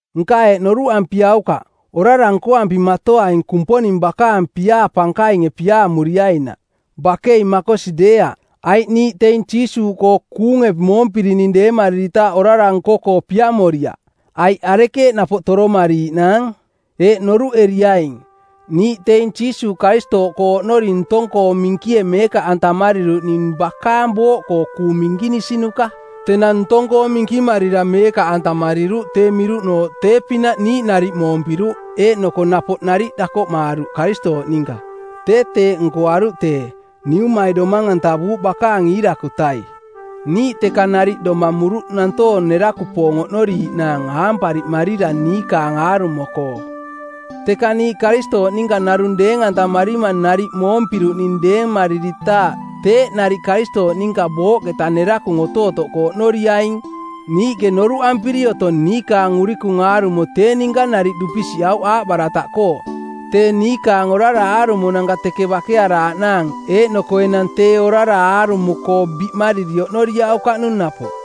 Nka eeꞌ noruꞌampiaukaꞌ, “Orara nkoampimatoaing Kumponing bakaang piaa pankainge piaamuriainaꞌ.” Bakei makosi deeaꞌ! Aiꞌ niiꞌ teing Jiisuuꞌkoo kuunge moompirining deemariritaaꞌ orara nko-koo piamoriaꞌ, aiꞌ arekeeꞌ napoꞌ toromariiꞌnaang? Eeꞌ noruꞌeriaing: Niiꞌ teing Jiisuuꞌ Karistooꞌkoo oꞌnori ntong-koo minkie meekaꞌantamariruꞌ ning bakaang booꞌkoo kuung minkinisinuka. Tenang ntong-koo minkimarira meekaꞌantamariruꞌ tee miruꞌnooꞌ tee-pinaꞌ niiꞌ nariꞌ moompiruꞌ eeꞌnoko napoꞌ nariꞌ dakoꞌmaaruꞌ Karistooꞌ ninka. Tee teeꞌ nkoaruꞌ tee, Niumai domang-antavuuꞌ bakaang iirakutai. Niiꞌ teka nariꞌ domamuruꞌ nantoong nerakupoong oꞌnoriiꞌnaang aampariꞌmarira niikaang aarumo-koo. Teka niiꞌ Karistooꞌ ninka narung deeng-antamarima nariꞌ moompiruꞌning deemariritaaꞌ teeꞌ nariꞌ Karistooꞌ ninka booꞌketa nerakung otootoꞌkoo oꞌnoriaing. Niiꞌke noruꞌampiri otong niikaang urikung aarumo tee ninka nariꞌ dupisiꞌauꞌ aaꞌbarataꞌkoo˜ tee niikaang orara aarumonanka teke bakearaaꞌnaang eeꞌnoko enang tee orara aarumo-koo biꞌmariri oꞌnoriaukaꞌnung napoꞌ.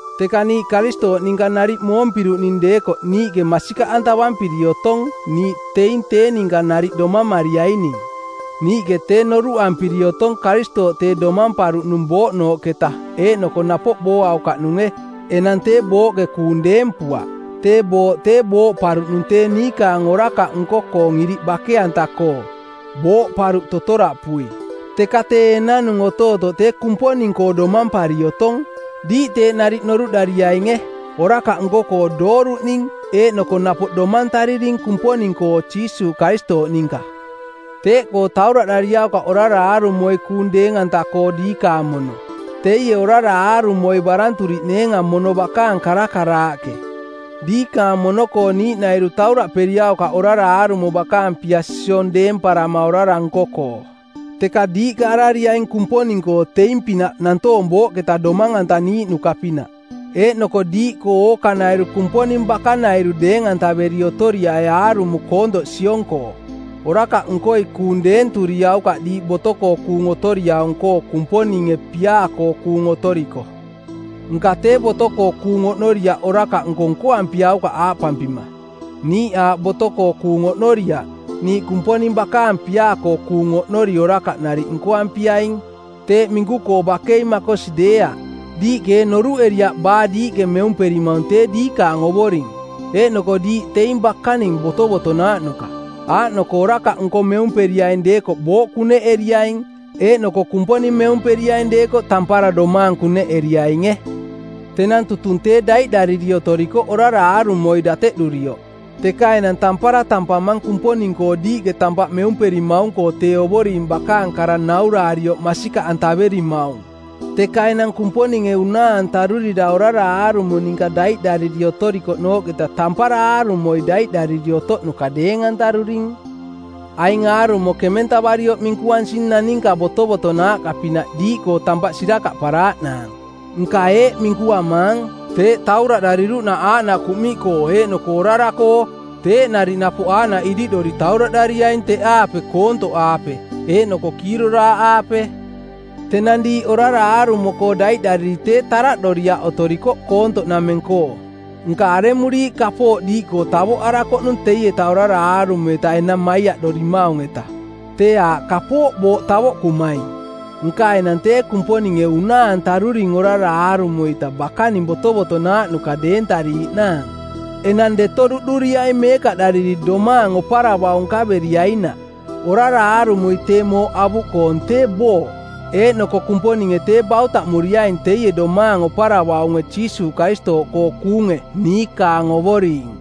Teka niiꞌ Karistooꞌ ninka nariꞌ moompiruꞌning deekoꞌ niiꞌke masikaꞌantavampiri otong niiꞌ teing tee ninka nariꞌ domamariaining. Niiꞌke tee noruꞌampiri otong Karistooꞌ tee domamparuꞌnung booꞌnooꞌketa eeꞌnoko napoꞌ booaukaꞌnunge; enang tee booꞌke kuung deempuaꞌ. Tee booꞌ tee booꞌparuꞌnung tee niikaang orakaꞌ nko-koong iriꞌ bake-anta-koo, booꞌparuꞌ totoraꞌpui. Teka tee enanung otootoꞌ tee Kumponing-koo domampari otong. Diiꞌ teeꞌ nariꞌ noruꞌdariainge: Orakaꞌ nko-koo dooruꞌning eeꞌnoko napoꞌ domantaririning Kumponing-koo Jiisuuꞌ Karistooꞌ ninka. Teeꞌkoo tauraꞌdariaukaꞌ orara aarumoi kuung deeng-anta-koo diikaang mono. Teie orara aarumoi baranturiꞌneenga mono bakaang karakaraaꞌke. Diikaang mono-koo niiꞌnairu tauraꞌperiaukaꞌ orara aarumo bakaang pia-siong deemparama orara nko-koo, teka diiꞌka arariaing Kumponing-koo teing-pinaꞌ nantoong booꞌketa domang-antaniiꞌnuka-pinaꞌ, eeꞌnoko diiꞌkoo ookanairu Kumponing bakanairu deeng-antaveri otoriai aarumo koontoꞌ siong-koo. Orakaꞌnkoi kuung deenturiaukaꞌ diiꞌ boto-koo kuung otoriaung-koo Kumponinge piaa-koo kuung otoriko. Nka tee boto-koo kuung oꞌnoriaꞌ orakaꞌnko nkoampiaukaꞌ aaꞌpampima, “Niiꞌ aaꞌ boto-koo kuung oꞌnoriaꞌ, niiꞌ Kumponing bakaang piaa-koo kuung oꞌnori orakaꞌ nariꞌ nkoampiaing.” Teeꞌ minku-koo bakei makosi deeaꞌ. Diiꞌke ee noruꞌeriaꞌ baa diiꞌke meumperimaung tee diikaang ovoring, eeꞌnoko diiꞌ teing bakaning botovotonaaꞌnuka, aaꞌnoko orakaꞌnko meumperiaing deekoꞌ booꞌ kuneꞌeriaing, eeꞌnoko Kumponing meumperiaing deekoꞌ tampara domaang kuneꞌeriainge. Tenang tutung tee daiꞌdariri otorikoꞌ orara aarumoi dateꞌdurioꞌ, teka enang tampara tampamang Kumponing-koo diiꞌke tampaꞌ meumperimaung-koo tee Ovoring bakaang kara nauraarioꞌ masikaꞌantaverimaung. Teka enang Kumponinge unaa-antarurira orara aarumo ninka daiꞌdariri otorikoꞌnooꞌketa tampara aarumoi daiꞌdariri otoꞌnuka deeng-antaruring. Aing aarumo kementavarioꞌ minkuansing naninka botovotonaaꞌka-pinaꞌ diiꞌkoo tampaꞌ sirakaꞌparaaꞌnaang. Nka eeꞌ minkuamaang: Teeꞌ tauraꞌdariruꞌnaꞌ aaꞌnaꞌ kuꞌmiꞌkoo eeꞌnoko orara-koo teeꞌ nariꞌ napoꞌ aaꞌnaꞌ iriꞌdori tauraꞌdariaing teꞌaape koontoꞌaape eeꞌnoko kiiroraaꞌaape. Tenang diiꞌ orara aarumo-koo daiꞌdariri tee taraꞌdoriaꞌ otorikoꞌ koontoꞌnameng-koo. Nka aremuriiꞌ kapooꞌ diiꞌkoo tavoꞌarakoꞌnung teieta orara aarumo-ita enang maiaꞌdorimaung-etaꞌ? Tee aaꞌ kapooꞌ booꞌ tavoꞌkumaing. Nka enang tee Kumponinge unaa-antaruring orara aarumo-ita bakaning botovotonaaꞌnuka deentariiꞌnaang. Enang deto duꞌduriaining meekaꞌdariri domaang oparavaung nkaveriainaꞌ. Orara aarumoi tee mooꞌ avuꞌkoong, tee booꞌ. Eeꞌnoko Kumponinge tee bautaꞌmuriaing teie domaang oparavaunge Jiisuuꞌ Karistooꞌkoo kuunge, niikaang Ovoring.